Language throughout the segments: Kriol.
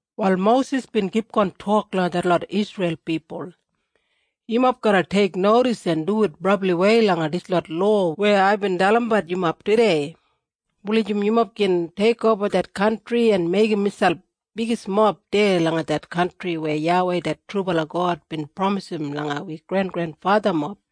Wal Mosis bin kipgon tok langa detlot Isreil pipul, “Yumob garra teiknodis en duwit brabliwei langa dislot lowa weya aibin dalimbat yumob tudei, wulijim yumob gin teikoba det kantri en meigim miselp bigismob deya langa det kantri weya YAWEI det trubala God bin pramisim langa wi grengrenfathamob.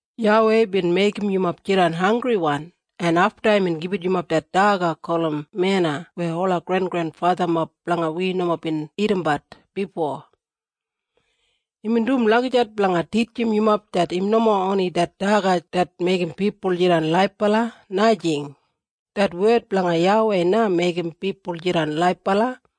YAWEI bin meigim yumob jidan hanggriwan en afta imbin gibit yumob det daga gulum mena weya ola grengrenfathamob blanga wi nomo bin dagadagat bifo. Imbin dum lagijat blanga titjim yumob im nomo oni det daga det meigim pipul jidan laibala, najing. Det wed blanga YAWEI na meigim pipul jidan laibala.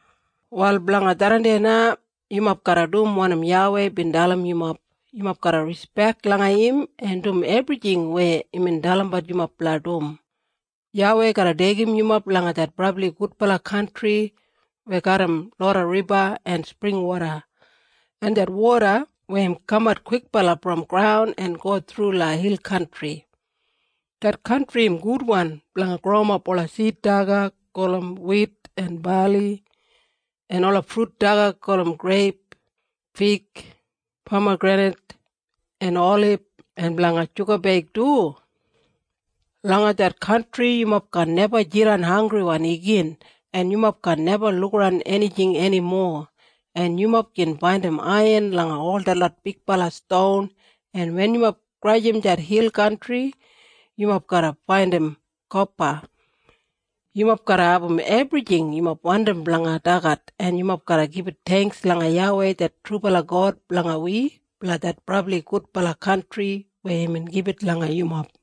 Wal blanga tharran deya na yumob garra dum wanim YAWEI bin dalim yumob. Yumob garra rispek langa im en dum ebrijing weya imbin dalim yumob blanga dum. YAWEI garra deigim yumob langa det brabli gudbala kantri weya garram loda riba en springwoda, en det woda weya im kamat kwikbala brom graun en go thru langa hil kantri. Det kantri im gudwan blanga growimap ola sid daga gulum wit en bali, en ola frut daga gulum greip, fig, pamagrenit en olib en blanga shugabeig du. Langa det kantri yumob kaan neba jidan hanggriwan igin en yumob kaan neba lukaran enijing enimo. En yumob gin faindim aiyan langa ol detlot bigbala ston en wen yumob grajim det hil kantri yumob garra faindim kopa. Yumob garra abum ebrijing yumob wandim blanga dagat en yumob garra gibit theingks langa YAWEI det trubala God blanga wi blanga det brabli gudbala kantri weya imbin gibit langa yumob.”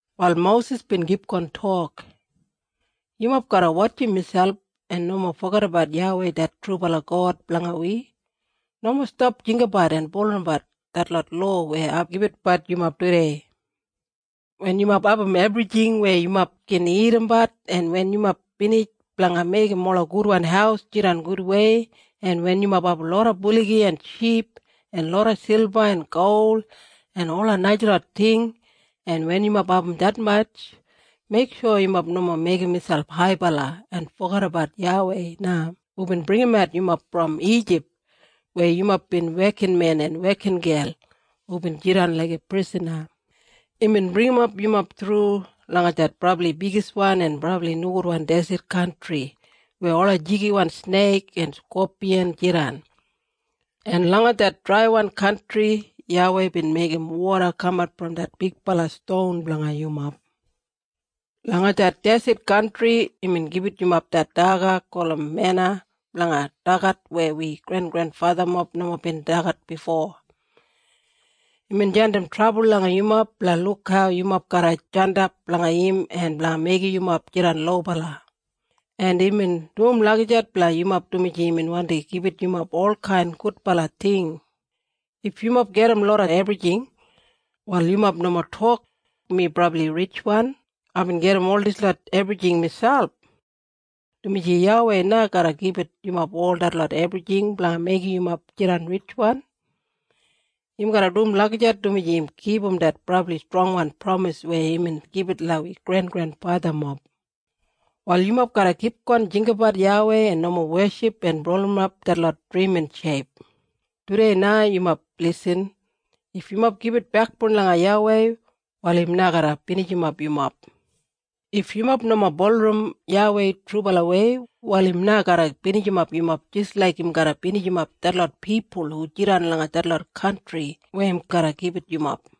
Wal Mosis bin kipgon tok, “Yumob garra wotjim miselp en nomo fogedabat YAWEI det trubala God blanga wi. Nomo stap jinggabat en bulurrumbat detlot lowa weya ai gibitbat yumob tudei. Wen yumob abum ebrijing weya yumob gin dagadagat en wen yumob binij blanga meigim ola gudwan haus jidan gudwei, en wen yumob abum loda buligi en ship en loda silba en gol en ola najalot ting, en wen yumob abum detmatj, meiksho yumob nomo meigim miselp haibala en fogedabat YAWEI na hubin bringimat yumob brom Ijip weya yumob bin wekinmen en wekingel hubin jidan laiga prisana. Imbin bringimap yumob thru langa det brabli bigiswan en brabli nogudwan deset kantri weya ola jigiwan sneik en skopiyan jidan. En langa det draiwan kantri YAWEI bin meigim woda kamat brom det bigbala ston blanga yumob. Langa det deset kantri imbin gibit yumob det daga gulum mena blanga dagat weya wi grengrenfathamob nomo bin dagat bifo. Imbin jandim trabul langa yumob blanga luk hau yumob garra jandap blanga im en blanga meigim yumob jidan lobala. En imbin dum lagijat blanga yumob dumaji imbin wandi gibit yumob olkain gudbala ting. If yumob gedim loda ebrijing, wal yumob nomo tok, ‘Mi brabli ritjwan. Aibin gedim ol dislot ebrijing miselp.’ Dumaji YAWEI na garra gibit yumob ol detlot ebrijing blanga meigim yumob jidan ritjwan. Im garra dum lagijat dumaji im kipum det brabli strongwan pramis weya imbin gibit langa wi grengrenfathamob. Wal yumob garra kipgon jinggabat YAWEI en nomo weship en bulurrumap detlot drimin sheip. Tudei na yumob lisin. If yumob gibit bekboun langa YAWEI, wal im na garra binijimap yumob. If yumob nomo bulurrum YAWEI trubalawei, wal im na garra binijimap yumob jis laik im garra binijimap detlot pipul hu jidan langa detlot kantri weya im garra gibit yumob.”